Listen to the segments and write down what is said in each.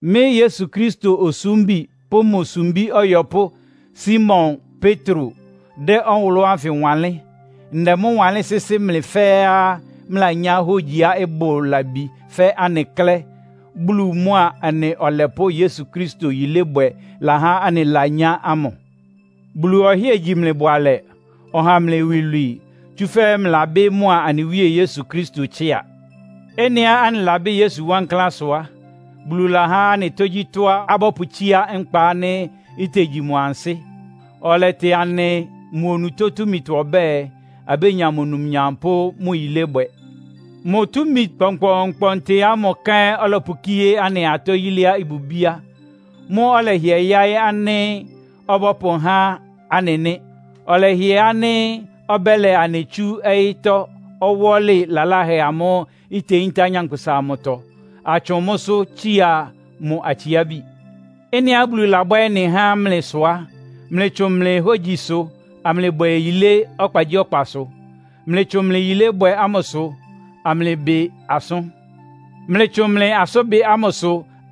Mɩ́ Yesu Kristo osúmbi pʋ́ mʋ sumbí ɔyɔpʋ́ Simon Petro dɛ́ ɔwʋlʋ́ ánfɩ wanlɩ́n. Ndɛ mʋ́ wanlɩ́n sɩ́sɩ́ mlɩ fɛ́ɛ́á mlɩlanyá hógyiá ɩbʋ labi fɛ́ anɩ klɛ́, Bulu mʋa anɩ Ɔlɛpʋ́ Yesu Kristo yilébwɛ lahá anɩlanyá ámʋ. Bulu ɔhɩ́ɛ gyi mlɩ bʋalɛ, ɔha mlɩ iwilwii, tsúfɛ́ mlɩlabɩ́ mʋa anɩ Wíe Yesu Kristo tsɩ́a. Ɩ́nɩá anɩlabɩ́ Yesu wankláán sʋ á, Bulu lahá anɩ tógyítɔ́á abɔ́pʋtsíá nkpa ánɩ́ itegyi mʋ ansɩ́. Ɔlɛtɩ anɩ mʋ onutó túmitɔ ɔbɛ́ɛ, abénya mʋ numnyam pʋ́ mʋ yilébwɛ. Mʋ túmi kpɔnkpɔɔnkpɔntɩ ámʋ kɛ́n ɔlɔpʋkíé anɩ atɔ yiléá ɩbʋ bíá. Mʋ́ ɔlɛhɩɛ yáɩ́ ánɩ́ ɔbɔ́pʋhá anɩ nɩ́. Ɔlɛhɩɛ ánɩ́ ɔbɛ́lɛ anɩ tsú ɔyɩ́tɔ́ ɔwɔ́lɩ laláhɛ ámʋ́ʋ́ iteyíntá nyankpʋsa amʋtɔ, atsʋ́ʋn mʋ́sʋ́ tsiá mʋ atsiábi. Ɩ́nɩá Bulu labwɛ́ ɩ́nɩ há mlɩ sʋ á, mlɩtsʋn mlɩ hógyisʋ amlɩbwɛ yilé ɔkpagyíɔkpasʋ. Mlɩtsʋn mlɩ yilébwɛ ámʋsʋ amlɩbɩ asʋ́n. Mlɩtsʋn mlɩ asʋ́nbɩ ámʋsʋ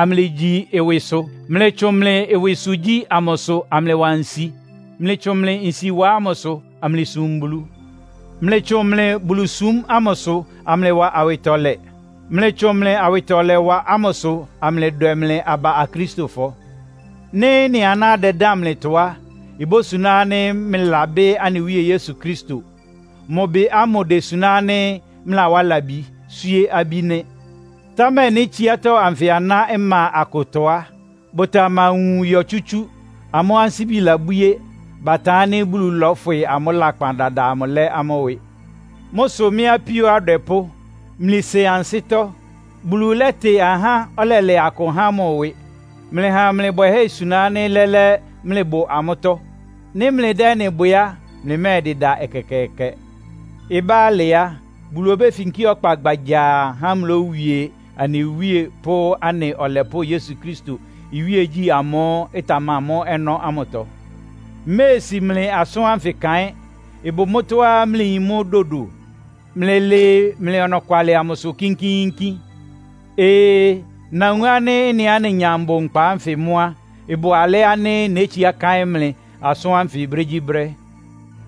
amlɩgyi ɩwɩsʋ. Mlɩtsʋn mlɩ ɩwɩsʋgyí amʋsʋ amlɩwa nsi. Mlɩtsʋn mlɩ nsiwa ámʋsʋ amlɩsum Bulu. Mlɩtsʋn mlɩ Bulusúm ámʋsʋ amlɩwa awɩtɔlɛ. Mlɩtsʋn mlɩ awɩtɔlɛwa ámʋsʋ amlɩdwɛ mlɩ aba Akristofɔ. Nɩ́ ɩ́nɩ aná dɛdán mlɩtɔ á, ibósuná ánɩ́ mlɩlabɩ́ anɩ Wíe Yesu Kristo. Mʋ bɩ ámʋ désuná ánɩ́ mlɩlawá labi, swíé abí nɩ́. Támɛ nɩ́ tsiátɔ́ anfɩ aná ɩma akʋtɔ á, bʋtamawun yɔ tsútsú. Amʋ́ ansíbi labwíé. Batan ánɩ́ Bulu lɔ́fwɩ amʋ́ lakpan dada amʋ lɛ́ amʋ́ ɩwɩ. Mʋ́ sʋ mɩ́ apíó adwɛpʋ́, mlɩsen ansɩ́tɔ́. Bulu lɛ́tɩ ahá, ɔlɛlɛ akʋ há mʋ ɩwɩ. Mlɩha mlɩ bwɛhɛ́ isuna ánɩ́ lɛ́lɛ́ mlɩbʋ amʋ́tɔ́. Nɩ́ mlɩdɛ́ ɩ́nɩ bwɛ á, mlɩmɛ́ɛdɩda ɛkɛkɛɛkɛ. Ɩbá alɩ á, Bulu obéfinkí ɔkpa gbagyaa há mlówie anɩ Wíe pʋ́ anɩ Ɔlɛpʋ́ Yesu Kristo iwíegyí ámʋ́ʋ́ ɩtamamɔ́ ɔnɔ́ ámʋtɔ. Mméesi mlɩ asʋ́n ánfɩ kaɩ́n. Ɩbʋ mʋ́tɔ́á mlɩyin mʋ́ dodo. Mlɩlɩɩ mlɩ ɔnɔkwalɩ amʋsʋ kínkíínkín. Ee, nawun ánɩ́ ɩ́nɩá nenya mbʋ nkpa ánfɩ mʋ́ á, ɩbʋ alɛ́ ánɩ́ nétsiá káɩ́n mlɩ asʋ́n ánfɩ brégyíbrɛ́.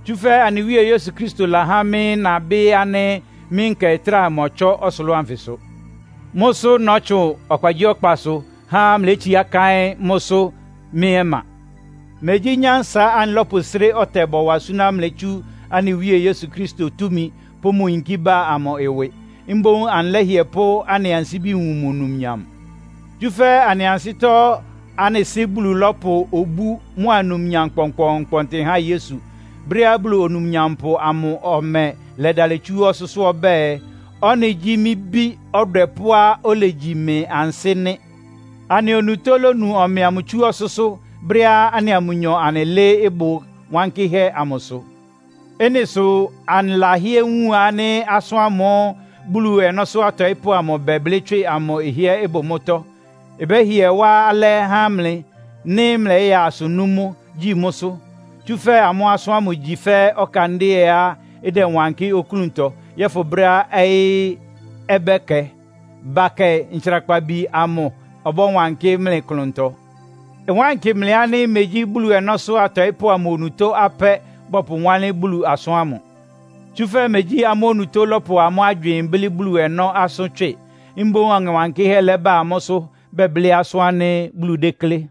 Tsúfɛ́ anɩ Wíe Yesu Kristo lahá mɩ́ nabɩ́ ánɩ́ mɩ́ nkɛ ɩtráa mɔtsɔ́ ɔsʋlʋ́ʋ anfɩsʋ. Mʋ́ sʋ nɔ́tsʋn ɔkpagyíɔkpasʋ há mlétsiá káɩ́n mʋ́sʋ́ mɩ́ ɔma. Megyí nyánsa anɩlɔ́pʋsré ɔtɛ bɔwa súná mlɩ tsú anɩ Wíe Yesu Kristo túmi pʋ́ mʋ yinkí ba amʋ ɩwɩ. Mboún anɩlɛ́hɩɛ pʋ́ anɩ ansíbi wun mʋ numnyam. Tsúfɛ́ anɩ ansɩ́tɔ́ anɩ Sɩ́ Bulu lɔ́pʋ obú mʋ́a numnyam kpɔnkpɔɔnkpɔntɩ há Yesu, brɛ́á Bulu Onumnyampʋ amʋ ɔmɛ lɛdalɩ tsu ɔsʋ́sʋ́ ɔbɛ́ɛ, “Ɔ́nɩ gyí mɩ́ Bí ɔdwɛpʋ́á olegyi mɩ ansɩ́ nɩ́.” Anɩ onutó lónu ɔmɛ amʋ tsú ɔsʋ́sʋ́, brɛ́á anɩa mʋnyɔ anɩlɩ́ɩ́ ɩbʋ wankɩ́hɛ́ amʋsʋ. Ɩ́nɩ sʋ anɩlahɩ́ɛ́ wun ánɩ́ asʋ́n ámʋ́ʋ́ Bulu ɔnɔ́sʋ́ atɔɩ́pʋ́ amʋ bɛblɩ́ tswɩ amʋ ɩhɩ́ɛ́ ɩbʋ mʋ́tɔ́. Ɩbɛ́hɩɛ wá alɛ́ há mlɩ, nɩ́ mlɛyaa asʋ nú mʋ́, gyi mʋ́sʋ́. Tsúfɛ́ amʋ́ asʋ́n ámʋ igyi fɛ́ ɔkandɩ́ɛá ɩdɛwankɩ́ oklúntɔ yɔ́fʋn brɛ́á ɔyɩ́ ɔbɛkɛ, bakɛ ɔtsrakpabi amʋ ɔbɔ́wankɩ́ mlɩ klʋntɔ. Ɩwánkɩ mlɩ ánɩ́ megyí Bulu ɔnɔ́sʋ́ atɔɩ́pʋ́ amʋ onutó apɛ́ bɔpʋwánlɩ́n Bulu asʋ́n ámʋ. Tsúfɛ́ megyí amʋ́ onutó lɔ́pʋ amʋ́ agywɩɩn blɩ́ Bulu ɔnɔ́ asʋ́n tswɩ. Mboún Ɔŋɛ Wankɩ́hɛ́ lɛ́bá amʋ́sʋ́ bɛblɩ́ asʋ́n ánɩ́ Bulu déklé.